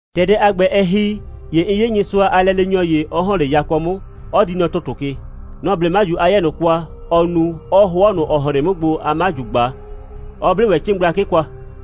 ‑Tɛ dɛ a ‑gbɛ, ɛ ‑hi, ‑ye 'n 'ye Nyɩsʋa a lɛleenyɔ ‑ye, 'ɔ ‑hɔn 'le yakɔ 'mʋ, 'ɔ di nɔ ‑tʋtʋ ke. Nɔ‑ 'ble 'maju a 'yɛɛ ꞊nʋ kwa, ɔɔ nu, 'ɔɔ 'hʋɔ ꞊nʋ, ‑ɔ hren 'mʋ gbo a 'maju ꞊gba, 'ɔ 'ble ‑wɛ 'cɩɩn gblakɩ kwa;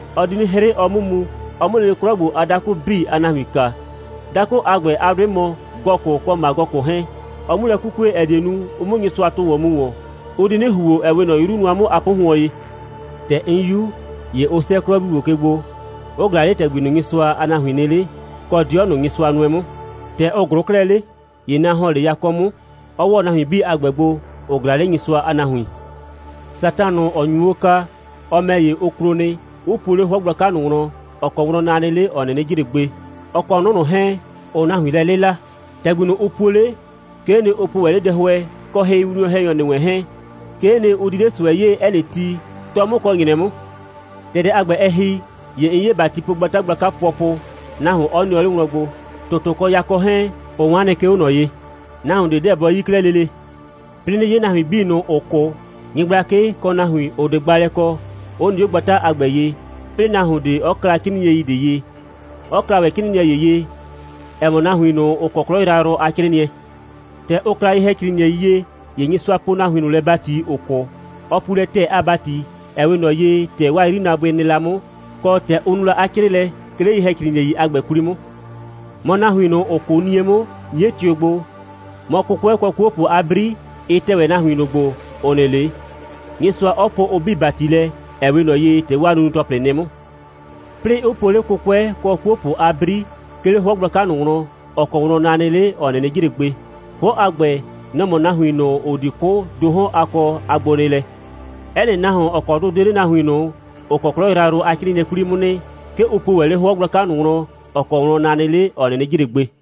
Ɔ di 'nɩ 'hrɩ, ɔ 'mʋ mu, ɔ 'mʋ lele 'klɔ ‑gbo a dakʋ 'bii a nahuin kaa. Dakʋ a ‑gbɛ, 'a 'dʋɩ mɔ Gɔgʋ, kɔ Magɔgʋ 'hɛɛn; ɔ 'mu lɛ 'kukue, ‑ɛ die nu, ʋ 'mʋ Nyɩsʋa tʋ ‑wɔn mu ‑wɔn. Ʋ di 'nɩ ‑huo, ‑ɛ 'we ꞊nɔ 'yru nʋa 'mʋ a 'pʋhʋɔn ye. ‑Tɛ 'n 'yu, ‑ye ʋ 'sɛɛ 'klɔ 'bii ‑gbo ke gbo, 'ʋ ꞊glaa 'le ‑tɛgbi ꞊nʋ, Nyɩsʋa a nahuin nɩ 'le, kɔ 'dɩɔ ꞊nʋ, Nyɩsʋa nʋɛ 'mʋ. ‑Tɛ ʋ ꞊glʋʋ 'klɛɛ 'le, ‑ye na ‑hɔn 'le yakɔ 'mʋ, 'ɔ ‑wɔ nahuin 'bii a ‑gbɛ gbo, ‑ʋ ꞊glaa 'le Nyɩsʋa a nahuin. Satan ꞊nʋ, ‑ɔ nyu o kaa, ɔ ‑mɛ ‑ye, ʋ klo nɩ, 'ʋ puo 'le 'hʋɔ gblaka ꞊nʋ wlɔn, ‑ɔ kɔ wlɔn na nɩ 'le, ‑ɔ 'nɩnɩ jre gbe, ɔ kɔ 'nʋ ꞊nʋ 'hɛɛn, ‑ʋʋ nahuin lɛ 'lɩla. ‑Tɛgbi ꞊nʋ, ʋ puo 'le, 'kee nɩ, ʋ po ‑wɛ 'le dɛhʋɛ kɔ hɩwinwlɔn‑hɛnyɔ ‑nɩ wɛn 'hɛɛn. 'Kee nɩ, ʋ di 'le ꞊sʋɛ 'yee, 'ɛ nɩ ti, 'tɔ 'mʋ kɔ ‑nyrɛ 'mʋ. ‑Tɛ dɛ a ‑gbɛ, ɛ ‑hi, ‑ye 'n 'ye ‑batipogbata gblaka pʋɔpʋ, nahuon 'ɔ nɩɔ 'le wlɔn gbo. ‑Tʋtʋ kɔ yakɔ 'hɛɛn, ʋ 'wan nɩ, 'ke 'o ꞊nɔ ye. Nahuon ꞊de 'deɛ bɔ 'yi 'klɛɛ lele. 'Plɩɩ 'nɩ 'ye nahuin 'bii ꞊nʋ, ‑ʋ 'kʋ, nyɩgblakɩ, kɔ nahuin, ‑ʋ 'de gbaalɛ kɔ, 'ʋ nɩ 'o gbata a ‑gbɛ ye, 'plɩɩ nahuon ꞊de 'ɔ kla 'crɩɩnɩɛi ꞊de ye, 'ɔ kla ‑wɛ 'crɩɩnɩɛ ‑ye ye, ‑ɛ mɔ nahuin ꞊nʋ, ‑ʋ kɔ 'klɔ yrayrʋ a 'crɩɩnɩɛ. ‑Tɛ ʋ kla ye‑hɛcrɩɩnɩɛi ye, ‑ye Nyɩsʋa poo nahuin ꞊nʋ lɛ ‑bati, ‑ʋ 'kʋ. Ɔ puu lɛ ‑tɛɛ a ‑bati, ‑ɛ 'we ꞊nɔ ye, ‑tɛ 'waa 'yrinaabʋɩ nɩ la 'mʋ, kɔ, ‑tɛ ʋ nu la 'a 'crɩɩlɛ, 'ke 'le ye‑hɛcrɩɩnɩɛi a ‑gbɛ 'kwli 'mʋ. Mɔ, nahuin ꞊nʋ, ‑ʋ 'kʋʋ 'nie 'mʋ, 'nie tɩʋ gbo, mɔ, 'kʋkʋɛ, kɔ 'kuopʋ a 'bri, ɩ tɛ ‑wɛ nahuin ꞊nʋ gbo, ‑ʋ nɩ 'le, Nyɩsʋa 'ɔ poo ʋ 'bii ‑bati lɛ, ‑ɛ 'we ꞊nɔ ye, ‑tɛ 'waa nunu‑tɔplɩ nɩ la 'mʋ. 'Plɩɩ 'ʋ po 'le 'kʋkʋɛ kɔ 'kuopʋ a 'bri, 'ke 'le 'hʋɔ gblaka ꞊nʋ wlɔn, ‑ɔ kɔ wlɔn na nɩ 'le, ‑ɔ 'nɩnɩ jre gbe. 'Hʋɔ a ‑gbɛ, nɔ‑ mɔ nahuin ꞊nʋ, ‑ʋ di 'kʋ ‑do 'hɔn a kɔ a gbonɩɩlɛ. 'Ɛ nɩ nahuon, ‑ɔ kɔ 'dʋ 'de 'le nahuin ꞊nʋ, ‑ʋ kɔ 'klɔ yrayrʋ a 'crɩɩnɩɛ 'kwli 'mʋ nɩ, 'ke ʋ puo ‑wɛ 'le 'hʋɔ gblaka ꞊nʋ wlɔn, ‑ɔ kɔ wlɔn na nɩ 'le, ‑ɔ 'nɩnɩ jre gbe.